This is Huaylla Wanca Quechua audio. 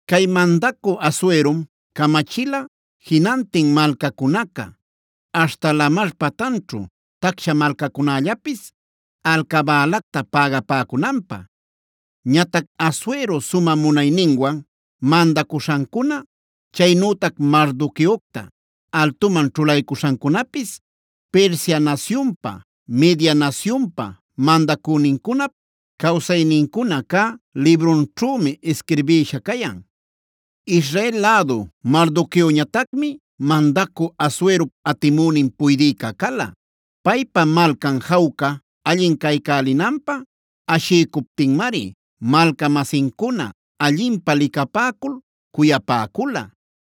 Cay mandacü Asuerom camachila jinantin malcacunaca aśhta lamar patanćhu tacsha malcacunällapis alcabälacta pägapäcunanpä. Ñatac Asuero sumä munayninwan mandacuśhancuna, chaynütac Mardoqueocta altuman ćhulaycuśhancunapis Persia nasyunpa, Media nasyunpa mandacünincunap cawsaynincuna cä librunćhümi isquirbïsha cayan. Israel lädu Mardoqueoñatacmi mandacü Asuerop atimünin puydïca cala. Paypa malcan jawca, allin caycälinanpä ashiycuptinmari malca-masincuna allinpä licapäcul cuyapäcula.